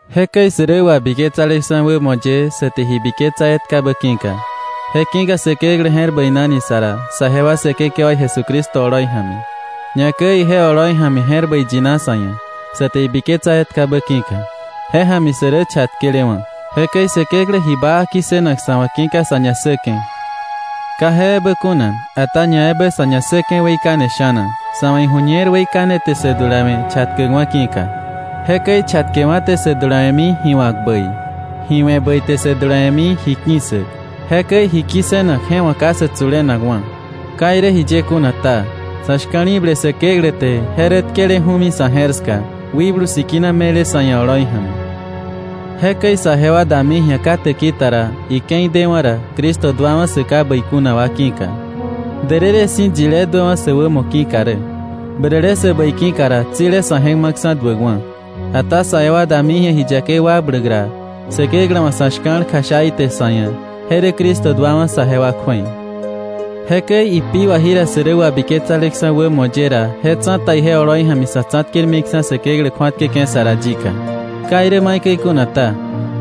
Jekäi sä rä wabiketsaleksa̱ wämo ye sa te ji biketsa etkabä ki̱ka, je ki̱ka Säkeklä je̱r bäinani sa ra saje wa Säkekewaí Jesucristo oloi ja̱mi. Ñakäi ije oloi ja̱mi je̱r bäi yina sa̱ ia̱, sa te ibiketsa etkabä ki̱ka. Je ja̱mi sä rä chatkelewa̱. Jekäi Säkeklä ji baa ki̱ssënak sa̱ wa̱ ki̱ka sa̱ ñassäke̱. Ka je ebä kuna, ata ñaebä sa̱ ñassäke̱ weikane sha̱na, sa̱ wa̱ iju̱ñer weikane te sä dulawe̱ chatkäkwa̱ ki̱ka. Jekäi chatkewa̱ te sä dulawe̱mi ji wa̱k bäi. Ji we̱ bäi te sä dulawe̱mi ji ki̱ssäk. Jekäi ji kissënak je wa̱ ka sä tsulenakwa̱. Ka irä jiye kuna ta, sa̱ shka̱li̱ble Säkeklä te je rä tkeleju̱mi sa̱ je̱r ska, Wikblu Sikina me̱le sa̱ ia̱ oloi ja̱mi. Jekäi saje wa dami ji̱a ka täki ta ra, ike̱i dewa̱ ra, Cristo duawa̱ sä ka bäi kuna wa ki̱ka. Därërë si̱ yilé duäwa̱ sä wämo ki̱ka rä. Bäräle sä bäi ki̱ka ra, tsile sa̱ je̱k ma̱ksa̱ duäkwa̱. Ata saje wa dami ji̱a ji yakei wakbläk ra, Säkeklä wa̱ sa̱ shka̱l kjasha ite sa̱ ia̱, je rä Cristo duawa̱ saje wa kju̱ei. Jekäi ipi wà jira sä rä wabiketsaleksa̱ wämo ye ra, je tsa̱ta ije oloi ja̱mi sa̱ tsa̱tkermiksa̱ Säkeklä kju̱atkäke̱ sa ra yika. Ka irä maikäi kuna ta,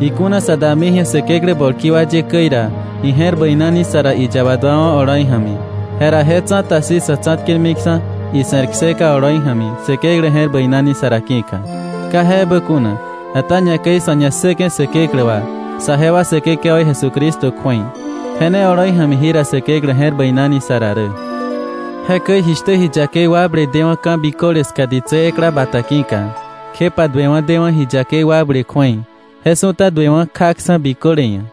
ikuna sa dami ji̱a Säkeklä bolki wa ye käi ra, ije̱r bäinani sa ra iyaba duawa̱ oloi ja̱mi, jera je tsa̱ta si̱ sa̱ tsa̱tkermiksa̱ ise̱r kseka oloi ja̱mi Säkeklä je̱r bäinani sa ra ki̱ka. Ka je ebä kuna, ata ñakäi sa̱ ñassäke̱ Säkeklä wà saje wa Säkekewaí Jesucristo kju̱ei. Je ne oloi ja̱mi jira Säkeklä je̱r bäinani sa ra rä. Jekäi jishtä ji yakei wakble dewa̱ ka̱ biköle ska ditsä ekla bata ki̱ka, kjepa duewa̱ dewa̱ ji yakei wakble kju̱ei, je su̱ta duewa̱ kjaksa̱ biköle ia̱,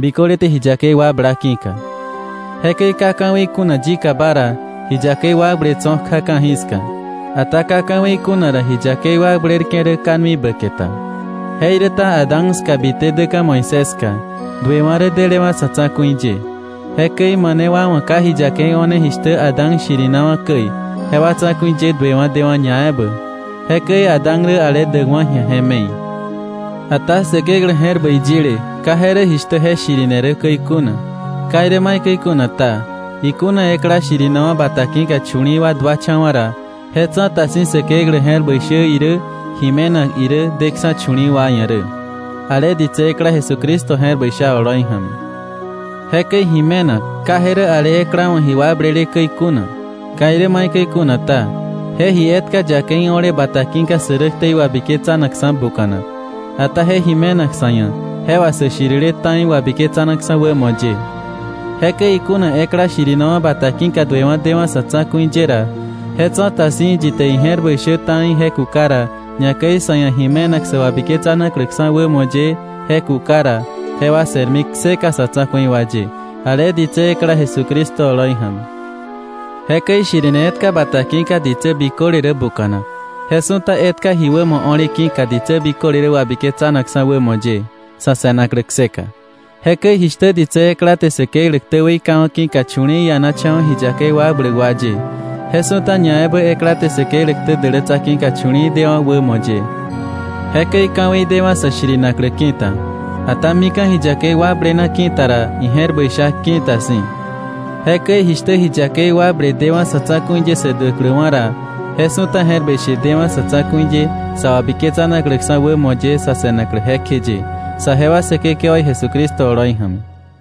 biköle te ji yakei wakbla ki̱ka. Jekäi ka ka̱wei kuna yikaba ra, ji yakei wakble tso̱ kja ka̱jiska. Ata ka ka̱wei kuna ra, ji yakei wakblerke̱ rä ka nui bäke ta. Jeiräta Adán ska bite däka̱ Moisés ska, duewa̱ rä delewa̱ sa̱ tsa̱ku̱i ye. Jekäi mane wa wa̱ ka ji yakei o̱ne jishtä Adán shirinawa̱ käi, jewa tsa̱ku̱i ye duewa̱ dewa̱ ñaebä. Jekäi Adán rä ale däkwa̱ ji̱a je me̱i. Ata Säkeklä je̱r bäi yile ka je rä jishtä je shirine rä käi kuna. Ka irä maikäi kuna ta, ikuna ekla shirinawa̱ bata ki̱ka chu̱li̱i̱ wa duacha̱wa̱ ra, je tsa̱ta si̱ Säkeklä je̱r bäi shä irä ji me̱nak irä deksa̱ chu̱li̱i̱ wa ia̱ rä, ale ditsä ekla Jesucristo je̱r bäi sha oloi ja̱mi. Jekäi ji me̱nak, ka je rä ale ekla wa̱ ji wakblele käi kuna. Ka irä maikäi kuna ta, je ji etka yakei o̱le bata ki̱ka sä rä ktei wabiketsanakksa̱ buka̱nak. Ata je ji me̱nak sa̱ ia̱, je wà sä shirile ta̱i wabiketsanakksa̱ wämo ye. Jekäi ikuna ekla shirinawa̱ bata ki̱ka duewa̱ dewa̱ sa̱ tsa̱ku̱i ye ra, je tsa̱ta si̱ yi te ije̱r bäi shä ta̱i je kuka ra, ñakäi sa̱ ia̱ ji me̱nak sä wabiketsanakläksa̱ wämo ye je kuka ra, jewa se̱rmi kseka sa̱ tsa̱ku̱i wa ye, ale ditsä ekla Jesucristo oloi ja̱mi. Jekäi shirine etka bata ki̱ka ditsä biköle rä buka̱nak, je su̱ta etka ji wämo o̱le ki̱ka, ditsä biköle rä wabiketsanakksa̱ wämo ye, sa̱ se̱naklä kseka. Jekäi jishtä ditsä ekla te Säkeklä ktä weikawa̱ ki̱ka chu̱li̱i̱ ianacha̱wa̱ ji yakei wakbläk wa ye, je su̱ta ñaebä ekla te Säkeklä ktä dälätsa ki̱ka chu̱li̱i̱ dewa̱ wämo ye. Jekäi ka̱wei dewa̱ sä shirinaklä ki̱ta. Ata mika̱ ji yakei wakblena ki̱ta ra, ije̱r bäi sha ki̱ta si̱. Jekäi jishtä ji yakei wakble dewa̱ sa̱ tsa̱ku̱i ye sä duäkläwa̱ ra, je su̱ta je̱r bäi she dewa̱ sa̱ tsa̱ku̱i ye sa wabiketsanakläksa̱ wämo ye sa̱ se̱naklä jekjeye, saje wa Säkekewaí Jesucristo oloi ja̱mi.